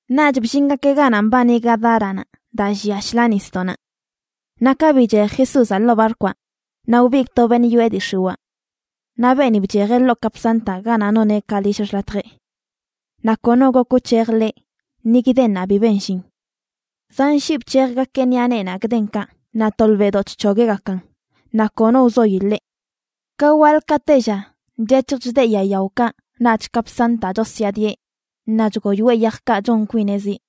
Naꞌch bllingakeꞌ ganaꞌ mbani Gadáranaꞌ daa llia shḻaa nisdoꞌnaꞌ. Naꞌ ka bichej Jesúzaꞌ ḻoo barkwaꞌ, naꞌ wbigꞌ to beṉꞌ yoꞌe dii x̱iwaa. Naꞌ beeni bchejeꞌ ḻoo kapsantaꞌ ganaꞌ noneꞌ ka lill xḻatjeꞌ. Naꞌ kono gok wc̱hej ḻeꞌ, ni gdennaꞌ bi ben llin. Zan shii bc̱hejgakeꞌ ṉiꞌa neenaꞌ gdenkaꞌ, naꞌ tolbeꞌdoꞌ chc̱hogueꞌgakan, naꞌ kono wzoyi ḻeꞌ. Ka waḻ ka tella chec̱hj chdeꞌ yaa yaokaꞌ naꞌch kapsantaꞌ chosyaadieꞌ naꞌ chgoyoeꞌ yajkaꞌ chon kwineꞌ ziꞌ.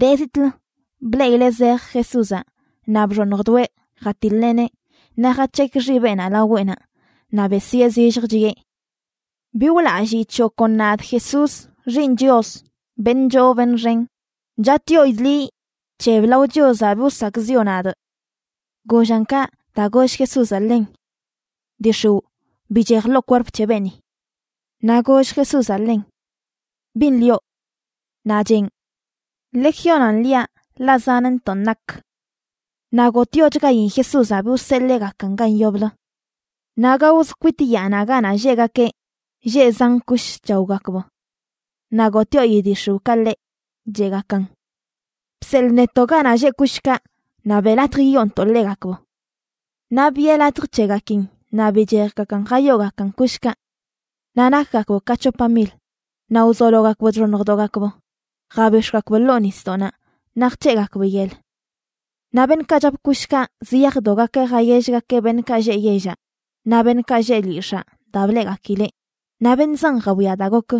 De zitꞌlə bleꞌileꞌ zej Jesúzaꞌ naꞌ bxoṉjdoeꞌ jatiḻeꞌneꞌ naꞌ jac̱hekꞌ xibeꞌnaꞌ laweꞌnaꞌ, naꞌ besyee zillj, chiꞌe: ―¡Bi wlalliꞌ c̱hoꞌ kon nadꞌ, Jesús, Xiiṉ Chios, beṉꞌ choo beṉꞌ xen! Chatꞌyoidꞌ liꞌ, ¡bc̱heb lao Chiozaꞌ bi wsakꞌziꞌo nadꞌ! Gollan kaꞌ daa goll Jesúzaꞌ ḻen: ―¡Dii x̱iwꞌ, bichej ḻoo kwerp c̱he beeni! Naꞌ goll Jesúzaꞌ ḻen: ―¿Bin lioꞌ? Naꞌ cheꞌn: ―Legiónan liaꞌ, ḻaꞌ zanntoꞌ nak. Naꞌ gotꞌyochgain Jesúzaꞌ bi wseḻeegakan gan yoblə. Naꞌ gaozə kwit yaanaꞌ ganaꞌ lleꞌgakeꞌ, lleꞌ zan kush chaogakb. Naꞌ gotꞌyoi dii x̱iwꞌkaꞌ ḻeꞌ, cheꞌgakan: ―Bseḻꞌ netoꞌ ganaꞌ lleꞌ kushkaꞌ naꞌ beꞌ latj yiyoontoꞌ ḻegakb. Naꞌ biꞌe latj c̱hegakin, naꞌ bichejgakan jayoogakan kushkaꞌ. Naꞌ nakgakb ka c̱hopa mil, naꞌ wzologakb chxoṉjdogakb jabix̱gakb ḻoo nisdoꞌnaꞌ, naꞌ jc̱heꞌgakb yel. Naꞌ beṉꞌkaꞌ chap kushkaꞌ ziyajdogakeꞌ jayellgakeꞌ beṉꞌkaꞌ lleꞌ yellaꞌ naꞌ beṉꞌkaꞌ lleꞌ lyix̱aa daa bleꞌgakileꞌ, naꞌ beṉꞌ zan jawia daa gok.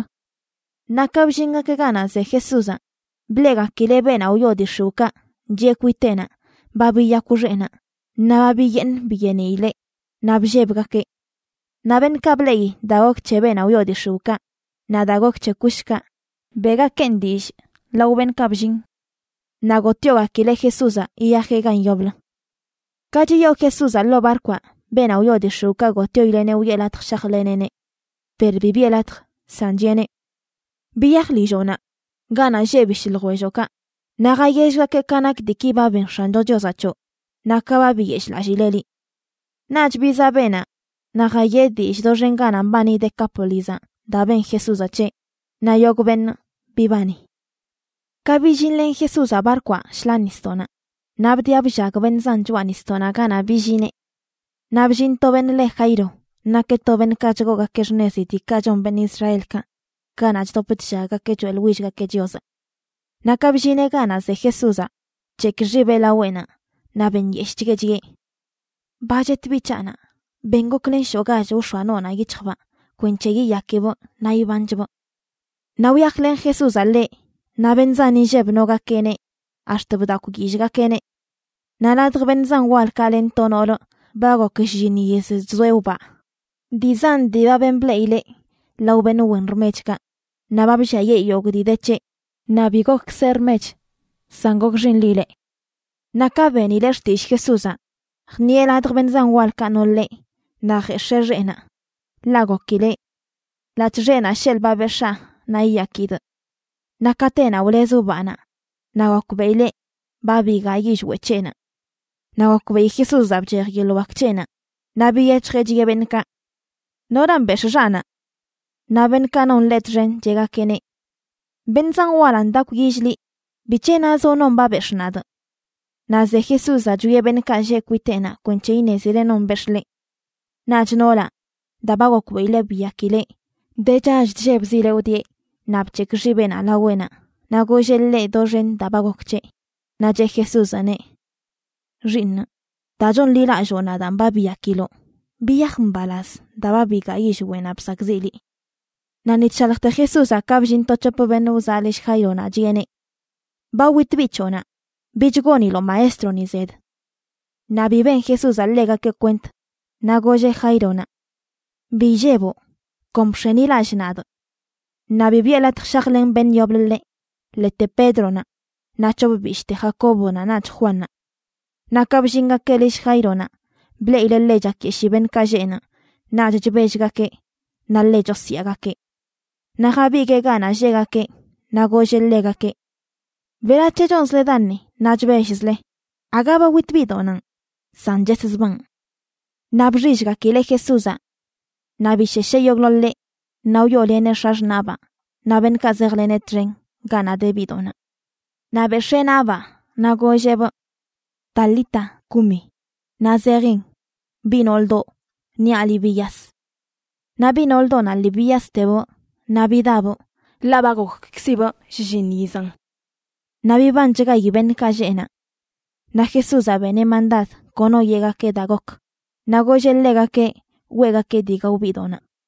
Naꞌ ka bllingakeꞌ ganaꞌ ze Jesúzaꞌ, bleꞌgakileꞌ beenaꞌ wyoo dii x̱iwꞌkaꞌ chiꞌe kwiteꞌnaꞌ ba biyakw xeꞌnaꞌ naꞌ ba biyeeṉ biyeeniileꞌ, naꞌ bllebgakeꞌ. Naꞌ beṉꞌkaꞌ bleꞌi daa gok c̱he beenaꞌ wyoo dii x̱iwꞌkaꞌ naꞌ daa gok c̱he kushkaꞌ, beꞌgakeꞌn dillꞌ lao beṉꞌkaꞌ bllin. Naꞌ gotꞌyogakileꞌ Jesúzaꞌ yiyajeꞌ gan yoblə. Ka chiyoo Jesúzaꞌ ḻoo barkwaꞌ, beenaꞌ wyoo dii x̱iwꞌkaꞌ gotꞌyoileꞌneꞌ wiꞌe latj shajleneꞌneꞌ. Per bi biꞌe latj, san chiꞌeneꞌ: ―Biyaj lilloꞌnaꞌ ganaꞌ lleꞌ bishꞌ ljwelloꞌkaꞌ, naꞌ jayellgakeꞌ ka nak diiki ba ben X̱ancho Chiozaꞌ c̱hoꞌ naꞌ ka ba biyeshꞌlallileꞌ liꞌ. Naꞌch bizaꞌ beenaꞌ naꞌ jayeꞌ dillꞌ doxen ganaꞌ mbani Decápolizaꞌ daa ben Jesúzaꞌ c̱heꞌ, naꞌ yogꞌ beṉꞌ bibani. Ka billinlen Jesúzaꞌ barkwaꞌ shḻaa nisdoꞌnaꞌ, naꞌ bdiꞌa bllag beṉꞌ zan choꞌa nisdoꞌnaꞌ ganaꞌ billineꞌ. Naꞌ bllin to beṉꞌ le Jairo, nakeꞌ to beṉꞌkaꞌ chgoogakeꞌ xṉezi diikaꞌ chon beṉꞌ Israelkaꞌ ganaꞌ chdop chllaggakeꞌ choeꞌḻwillgakeꞌ Chiozaꞌ. Naꞌ ka bllineꞌ ganaꞌ ze Jesúzaꞌ, bc̱hekꞌ xibeꞌ laweꞌnaꞌ naꞌ benyeshꞌchgueꞌ, chiꞌe: ―Ba chet biꞌ c̱haꞌnaꞌ. Ben goklen shoꞌgach wx̱oa noonaꞌ yic̱hjbaa kwenc̱he yiyakibꞌ naꞌ ibanchbꞌ. Naꞌ wyajlen Jesúzaꞌ ḻeꞌ, naꞌ beṉꞌ zan inlleb nogakeꞌneꞌ ax̱t bdakwyillgakeꞌneꞌ. Naꞌ ladj beṉꞌ zan walkaꞌ len to noolə ba gok shlliṉ yiz chzoeꞌ wbaa. Dii zan dii ba ben bleꞌileꞌ lao beṉꞌ wen rmechkaꞌ, naꞌ ba blliayee yogꞌ dii de c̱heꞌ naꞌ bi gokkzeꞌ rmech, san gokxinlileꞌ. Naꞌ ka benileꞌ xtillꞌ Jesúzaꞌ, jṉiꞌe ladj beṉꞌ zan walkaꞌ no ḻeꞌ naꞌ jex̱ee xeꞌnaꞌ. Ḻaꞌ gokileꞌ: “Ḻaꞌc̱hꞌ xeꞌnaꞌ sheḻꞌ ba bex̱aa, naꞌ yiyakidꞌ.” Naꞌ katenaꞌ wlez wbaanaꞌ naꞌ gokbeꞌileꞌ ba bigaa yillweꞌ c̱heꞌnaꞌ. Naꞌ gokbeꞌi Jesúzaꞌ bchej yeḻꞌ wak c̱heꞌnaꞌ, naꞌ biyec̱hjeꞌ chiꞌe beṉꞌkaꞌ: ―¿Noran bex̱ꞌ xaꞌnaꞌ? Naꞌ beṉꞌkaꞌ non ḻeꞌ txen cheꞌgakeꞌneꞌ: ―Beṉꞌ zan walan ndakwyill liꞌ. ¿Bic̱he nazoꞌ: “Non ba bex̱ꞌ nadꞌ”? Naꞌ ze Jesúzaꞌ chwieꞌ beṉꞌkaꞌ lleꞌ kwiteꞌnaꞌ kwenc̱he iṉezileꞌ non bex̱ꞌ ḻeꞌ. Naꞌch noolaꞌ, daa ba gokbeꞌileꞌ biyakileꞌ, de chall chllebzileꞌ wdieꞌ naꞌ bc̱hekꞌ xibeꞌnaꞌ laweꞌnaꞌ naꞌ golleꞌ ḻeꞌ doxen daa ba gok c̱heꞌ. Naꞌ cheꞌ Jesúzaꞌneꞌ: ―Xiiṉꞌ, daa chonḻilalloo nadaan ba biyakiloꞌ. Biyaj mbalaz daa ba bigaa yillweꞌnaꞌ bsakꞌziꞌ liꞌ. Naꞌ ni chshaljte Jesúzaꞌ ka bllin to c̱hop beṉꞌ wzaꞌ lill Jaironaꞌ, chiꞌeneꞌ: ―Ba wit biꞌ c̱hoꞌnaꞌ. Bich goniloꞌ maestroni zed. Naꞌ bi ben Jesúzaꞌ ḻegakeꞌ kwent, naꞌ golleꞌ Jaironaꞌ: ―Bi illeboꞌ. Kon bx̱enilallꞌ nadꞌ. Naꞌ bi biꞌe latj shajlen beṉꞌ yoblə ḻeꞌ, ḻete Pédronaꞌ naꞌ c̱hop bishꞌte, Jacóbonaꞌ naꞌch Juannaꞌ. Naꞌ ka bllingakeꞌ lill Jaironaꞌ, bleꞌileꞌ ḻe chakyeshii beṉꞌkaꞌ lleꞌ naꞌ naꞌch chbellgakeꞌ naꞌ ḻe chosyaagakeꞌ. Naꞌ jabiguee ganaꞌ lleꞌgakeꞌ naꞌ golleꞌ ḻegakeꞌ: ―¿Berac̱he chonzle daṉe naꞌ chbellzle? Aga ba wit biꞌdoꞌnanꞌ, san cheszbaan. Naꞌ bxillgakileꞌ Jesúzaꞌ. Naꞌ bishesheꞌ yogꞌḻoḻeꞌ naꞌ wyooleneꞌ x̱axṉaꞌbaa naꞌ beṉꞌkaꞌ zejleneꞌ txen ganaꞌ de biꞌdoꞌnaꞌ. Naꞌ bex̱ee naꞌbaa naꞌ golleꞌbꞌ: ―Talita, cumia ―naꞌ zejin: Biꞌ nooldoꞌ, niaꞌ liꞌ biyas. Naꞌ biꞌ nooldoꞌnaꞌ lii biyastebꞌ naꞌ bidabꞌ, ḻaꞌ ba gokkzibꞌ shlliṉ yizan. Naꞌ bibanchgayi beṉꞌkaꞌ lleꞌ naꞌ. Naꞌ Jesúzaꞌ beneꞌ mandad kono yeꞌgakeꞌ daa gok, naꞌ golleꞌ ḻegakeꞌ weꞌgakeꞌ dii gao biꞌdoꞌnaꞌ.